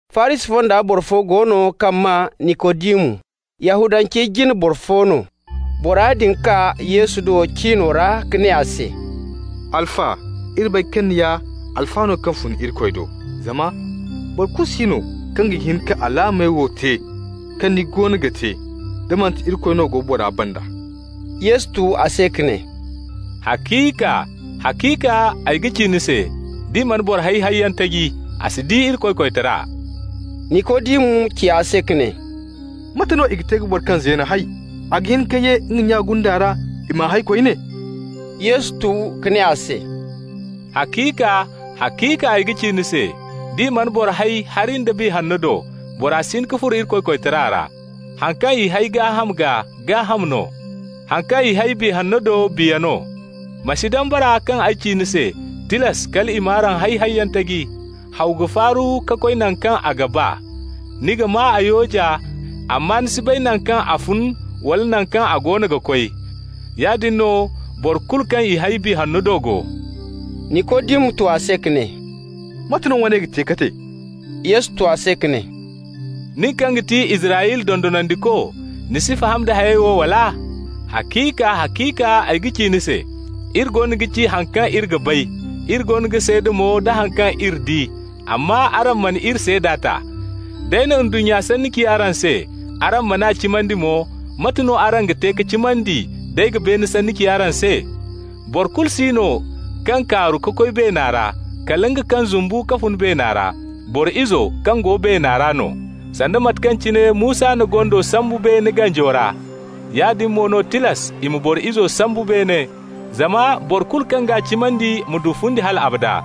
Farisi fonda boro fo go no kaŋ maa Nikodimu, Yahudancey jine boro fo no. Bora din kaa Yesu do cino ra ka ne a se: «Alfa, iri bay kaŋ ni ya alfa no kaŋ fun Irikoy do, zama boro kulu si no kaŋ ga hin ka alaamey wo te kaŋ ni goono ga te da manti Irikoy no go bora banda.» Yesu tu a se ka ne: «Haciika, haciika, ay ga ci ni se: d'i mana boro hay hayyaŋ taji, a si di Irikoy koytara.» Nikodimu ci a se ka ne: «Mate no i ga te ka boro kaŋ zeen hay? A ga hin ka ye nga nya gunda ra, i m'a hay koyne?» Yesu tu ka ne a se: «Haciika, haciika ay ga ci ni se: d'i mana boro hay hari nda Biya Hanno do, bora si hin ka furo Irikoy koytara ra. Haŋ kaŋ i hay gaaham gaa, gaaham no. Haŋ kaŋ i hay Biya Hanno do, biya no. Ma si dambara kaŋ ay ci ni se: tilas kal i m'araŋ hay hayyaŋ taji. Haw ga faaru ka koy naŋ kaŋ a ga ba. Ni ga maa a yooja, amma ni si bay naŋ kaŋ a fun wala naŋ kaŋ a goono ga koy. Yaadin no boro kulu kaŋ i hay Biya Hanno do go.» Nikodimu tu a se ka ne: «Mate no woone ga te ka te?» Yesu tu a se ka ne: «Nin kaŋ ga ti Israyla dondonandiko, ni si faham da hayey wo, wala? Haciika, haciika ay ga ci ni se: iri goono ga ci haŋ kaŋ iri ga bay, iri goono ga seeda mo da haŋ kaŋ iri di, amma araŋ mana iri seeda ta. D'ay na ndunnya sanni ci araŋ se, araŋ man'a cimandi mo, mate no araŋ ga te ka cimandi d'ay ga beene sanni ci araŋ se? Boro kulu si no kaŋ kaaru ka koy beena ra, kala nga kaŋ zumbu ka fun beena ra, Boro Izo kaŋ go beena ra no. Sanda mate kaŋ cine Musa na gondo sambu beene ganjo ra, yaadin mo no tilas i ma Boro Izo sambu beene zama boro kulu kaŋ g'a cimandi ma du fundi hal abada.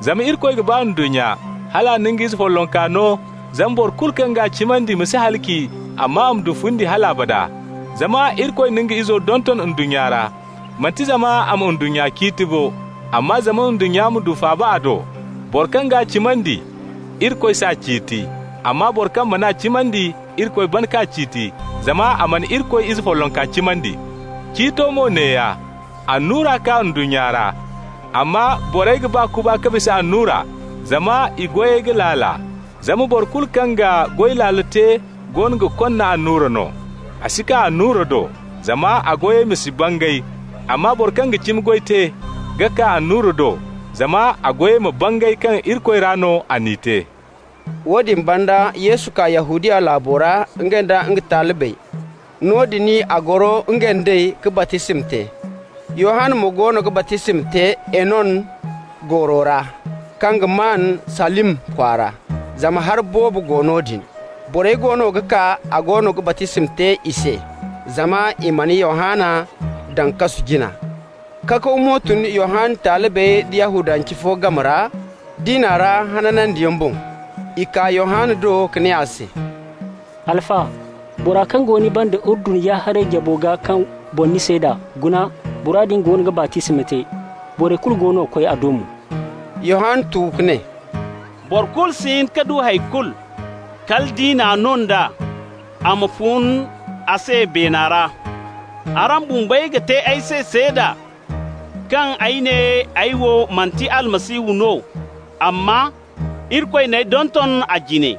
Zama Irikoy ga ba ndunnya hal a na nga Izo follonka no, zama boro kulu kaŋ g'a cimandi ma si halaci, amma a ma du fundi hal abada. Zama Irikoy na nga Izo donton ndunnya ra, manti zama a ma ndunnya ciiti bo, amma zama ndunnya ma du faaba a do. Boro kaŋ g'a cimandi, Irikoy s'a ciiti, amma boro kaŋ man'a cimandi, Irikoy ban k'a ciiti, zama a mana Irikoy Ize follonka cimandi. Ciito mo neeya: annura kaa ndunnya ra, amma borey ga ba kuba ka bisa annura, zama i goyey ga laala. Zama boro kulu kaŋ ga goy laalo te goono ga konna annura no. A si kaa annura do, zama a goyey ma si bangay. Amma boro kaŋ ga cimi goy te ga kaa annura do, zama a goyey ma bangay kaŋ Irikoy ra no a n'i te.» Woodin banda Yesu kaa Yahudiya laabo ra, nga nda nga talibey. Noodin a goro, nga nd'ey ka baptisma te. Yohanna mo goono ga baptisma te Enon gooro ra, kaŋ ga maan Salim kwaara, zama hari boobo go noodin. Borey goono ga kaa, a goono ga baptisma te i se. Zama i mana Yohanna daŋ kasu jina. Kakaw mo tun Yohanna talibey da Yahudance fo game ra, diina ra hananyaŋ boŋ. I kaa Yohanna do ka ne a se: «Alfa, bora kaŋ go ni banda Urdun ya-haray jabo gaa kaŋ boŋ ni seeda, guna, bora din goono ga baptisma te, borey kulu goono ga koy a do mo.» Yohanna tu ka ne: «Boro kulu si hin ka du hay kulu, kala nd'i n'a no nd'a a ma fun a se beena ra. Araŋ bumbey ga te ay se seeda kaŋ ay ne ay wo manti Almasihu no, amma Irikoy n'ay donton a jine.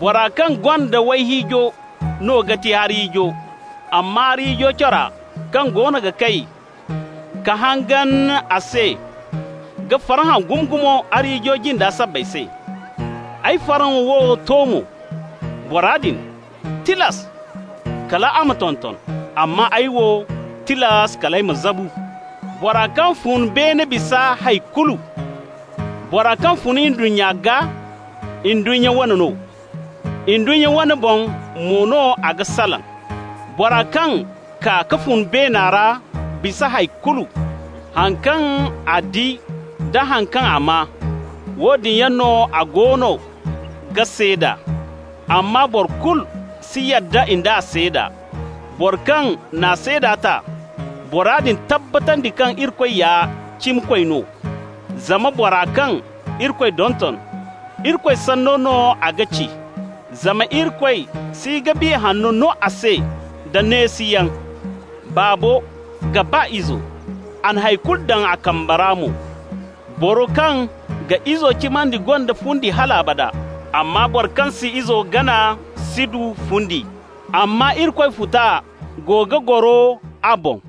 Bora kaŋ gonda wayhiijo no ga ti arhiijo, amma arhiijo cora kaŋ goono ga kay ka hangan a se ga farhã gumo-gumo arhiijo jinda sabbay se. Ay farhã wo to mo. Bora din, tilas kal a ma tonton, amma ay wo, tilas kal ay ma zabu. Bora kaŋ fun beene bisa hay kulu. Bora kaŋ fun ndunnya gaa, ndunnya wane no, ndunnya wano boŋ mo no a ga salaŋ. Bora kaŋ kaa ka fun beena ra bisa hay kulu. Haŋ kaŋ a di da haŋ kaŋ a maa, woodin yaŋ no a goono ga seeda, amma boro kulu si yadda nd'a seeda. Boro kaŋ n'a seeda ta, bora din tabbatandi kaŋ Irikoy ya cimikoy no. Zama bora kaŋ Irikoy donton, Irikoy sanno no a ga ci, zama Irikoy si ga Biya Hanno no a se da neesiyaŋ. Baabo ga ba Izo, a na hay kulu daŋ a kamba ra mo. Boro kaŋ ga Izo cimandi gonda fundi hal abada, amma boro kaŋ si Izo gana si du fundi, amma Irikoy futa go ga goro a boŋ.»